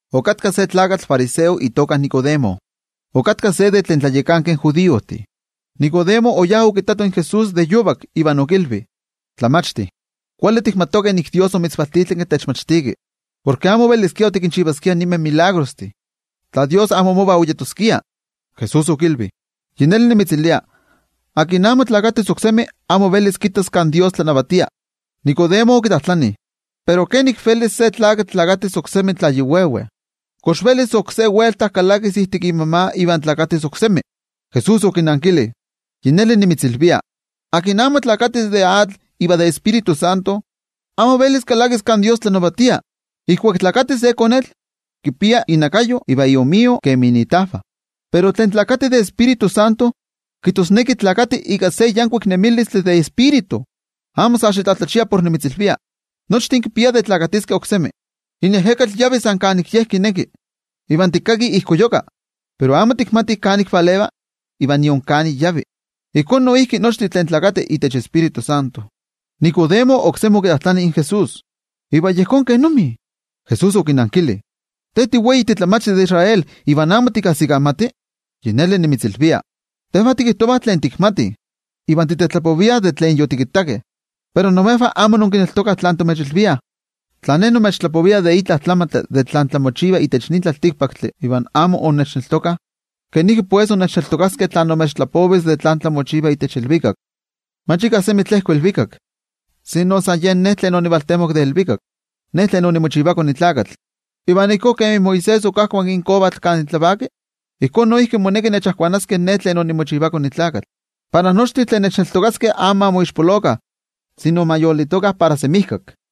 Okatka se tlakatl fariseo itoka Nicodemo, okatka se de tlen tlayakankeh judiojtih. Nicodemo oyá okittato in Jesús de yovak, iva okilvi: —Tlamachti, kuali tikmatih nik Dios omitzvaltitlanki techmachtiki, porke amo oveliskia otikinchivaskia ninmeh tetzavkaneskayomeh, tla Dios amo mova oyeskia. Jesús okilvi: —Yi neli nimitzilvia, akin amo nesis oksemi, amo velis kittas kan Dios tlanavatia. Nicodemo okitlajtlani: —Pero ¿kenik velis se tlakatl nesis oksemi tla yi veve? ¿Kox velis oksé welta kalakis ijtik imama iva nesis oksemi? Jesús okinankili: —Yi neli nimitzilvia, akin amo nesis de atl iva de Tioijyotzintli, amo velis kalakis kan Dios tlanavatia. Ijkuak nesi se konetl, kipia inakayo iva iomio kemi itajvah, pero tlen nesi de Tioijyotzintli, kijtosneki nesi ika se yankuik nemilistli de Tioijyotzintli. Amo sa xitlatlachia por nimitzilvia: “Nochtin kipiah de nesiskeh oksemi.” In ejekatl yavi san kan ye kineki. Iva tikkaki ijkoyuka, pero amo tikmati kan valeva iva nion kan ik yavi. Ijkó noijki nochtin tlen nesih itech Tioijyotzintli. Nicodemo oksemi okitlajtlani in Jesús: —¿Iva yejón kenomi? Jesús okinankili: —¿Te tiwei titlamachti de Israel iva amo tikajsikamati? Yi neli nimitzilvia, tejvah tikijtovah tlen tikmatih, iva titetlapoviah de tlen yotikittakeh, pero imejvah amo inkineltokah tlan timechilviah. Tla Ne nimechtlapovia itla tlamantli tlen tlamochiva itech nin tlaltikpaktli, iva amo innechneltokah, ¿kenik velis innechneltokaskeh tla nimechtlapovis tlen tlamochiva itech ilvikak? ’Mach ika semi tlejko ilvikak, sino san yen tlen ovaltemok de ilvikak, kijtosneki, yen iKone in Tlakatl. Iva ijkó kemi Moisés okajkuanki in kovatl kan tlavaki, ijkó noijki moneki kajkuanaskeh iKone in Tlakatl, para nochtin tlen kineltokaskeh amo ma moixpolokah, sino ma yolitokah para semijkak.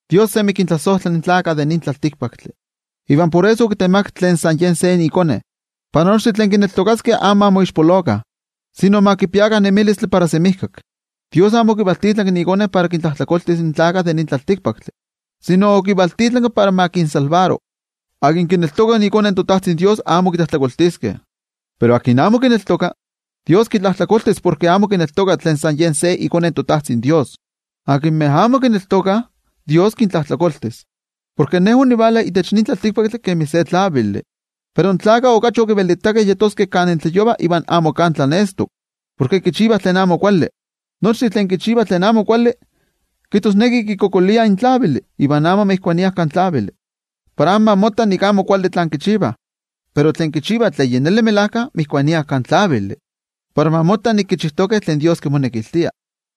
’Dios sa tlawel kintlasojtla in tlaltikpaktlakah, iva por eso okitemakak tlen san Ye se iKone, para nochtin tlen kineltokaskeh amo ma moixpolokah, sino ma kipiakah nemilistli para semijkak. Dios amo okivaltitlanki iKone para kintlajtlakoltis in tlaltikpaktlakah, sino okivaltitlanki para ma kinmakixti. ’Tlen kineltoka iKone toTajtzin Dios, amo kitlajtlakoltiskeh. Pero tlen amo kineltoka, Dios kitlajtlakoltis porke amo kineltoka tlen san Ye se iKone toTajtzin Dios. Tlen amo kineltokah, Dios kintlajtlakoltis, porke in tlavili ovala itech nin tlaltikpaktli, pero in tlaltikpaktlakah okachi okivelitakeh yeskeh kan tlayova iva amo kan tlanestok, porke kichivah tlen amo kuali. Nochtin tlen kichivah tlen amo kuali, kijtosneki kikualankaitah in tlavili iva amo motokiah kan tlavili, para amo ma motta nik amo kuali tlen kichivah. Pero tlen kichivah tlen melajkayotl motokiah kan tlavili, para ma motta nik kichijtokeh tlen Dios kimonekiltia.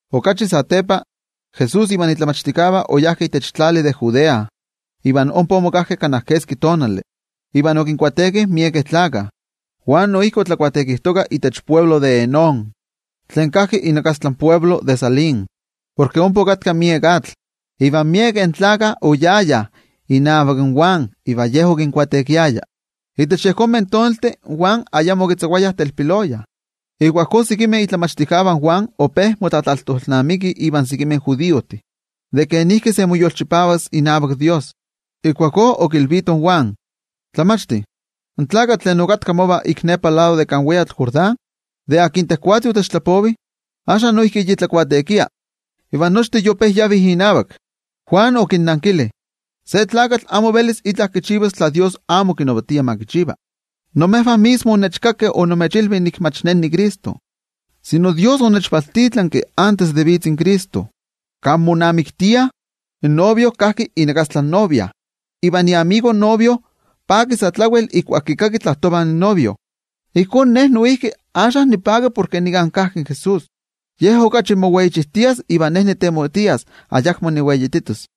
Okachi satepa, Jesús ivan momachtijkeh oyajkeh itech tlali de Judea, iva ompa omokajkeh kana keski tonali, iva okinbautisaro miekeh tlakah. Juan noijki otlabautisarojtoka itech altepetl de Enón, tlen kajki inakastla in altepetl de Salim, porke ompa okatka miek atl. Iva miekeh gentejtih oyayah inavak Juan iva ye okinbautisarovaya. Itech yejonmeh tonaltih Juan ayamo okitzakuayah telpiloya. Ijkuakó sekimeh momachtijkeh de Juan ope motlatlajtolnamikih ivan sekimeh judiojtih de kenik se moyolchipavas inavak Dios. Ijkuakó okilvitoh in Juan: —Tlamachti, in tlakatl tlen okatka mova ik nepa lado de kan weyatl Jordán, de tlen tejwatzi otechtlapovi, axka noijki yi tlabautisarova, iva nochtin yope yavih inavak. Juan okinnankili: —Se tlakatl amo velis itla kichivas tla Dios amo kinavatia ma kichiva. Imejvah mismo onnechkakeh onimechilvi nik mach ne niCristo, sino Dios onechvaltitlanki antes de vitz in Cristo. Kan monamiktiah, in novio kajki inakastla in novia, iva iyolikni in novio paki sa tlawel ijkuak kikaki tlapova in novio. Ijkó ne noijki axka nipaki porke nika kajki in Jesús. Ye okachi moweichijtias, iva ne nitemotias ayakmo niweititos.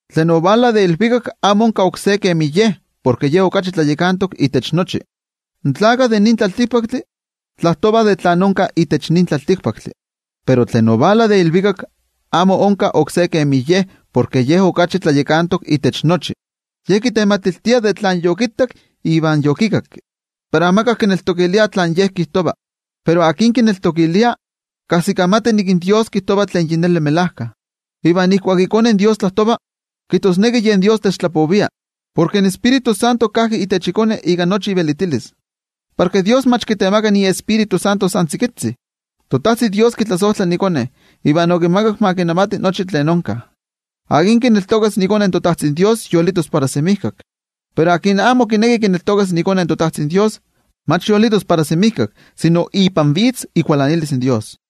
’Tlen ovala de ilvikak amo onka oksé kemi Ye porke Ye okachi tlayakantok itech nochi. In tlaltikpaktlakah, tlapovah de tlen onka itech nin tlaltikpaktli. Pero tlen ovala de ilvikak amo onka oksé kemi Ye porke Ye okachi tlayakantok itech nochi. Ye kitematiltia de tlen yokittak iva tlen yokikakki, pero amika kineltokilia tlen Ye kijtova. Pero tlen kineltokilia, kajsikamati nik in Dios kijtova tlen yi neli melajka. Iva ijkuak iKone in Dios tlajtova, kijtosneki yen Dios techtlapovia, porke in Tioijyotzintli kajki itech iKone ika nochi ivelitilis porke Dios mach kitemaka iTioijyotzi san tzikitzi. ToTajtzin Dios kitlasojtla iKone, iva okimakak ma kinavati nochi tlen onka. Tlen kineltokas iKone toTajtzin Dios yolitos para semijkak. Pero tlen amo kineki kineltokas iKone toTajtzin Dios, mach yolitos para semijkak sino ipan vitz ikualanilis in Dios.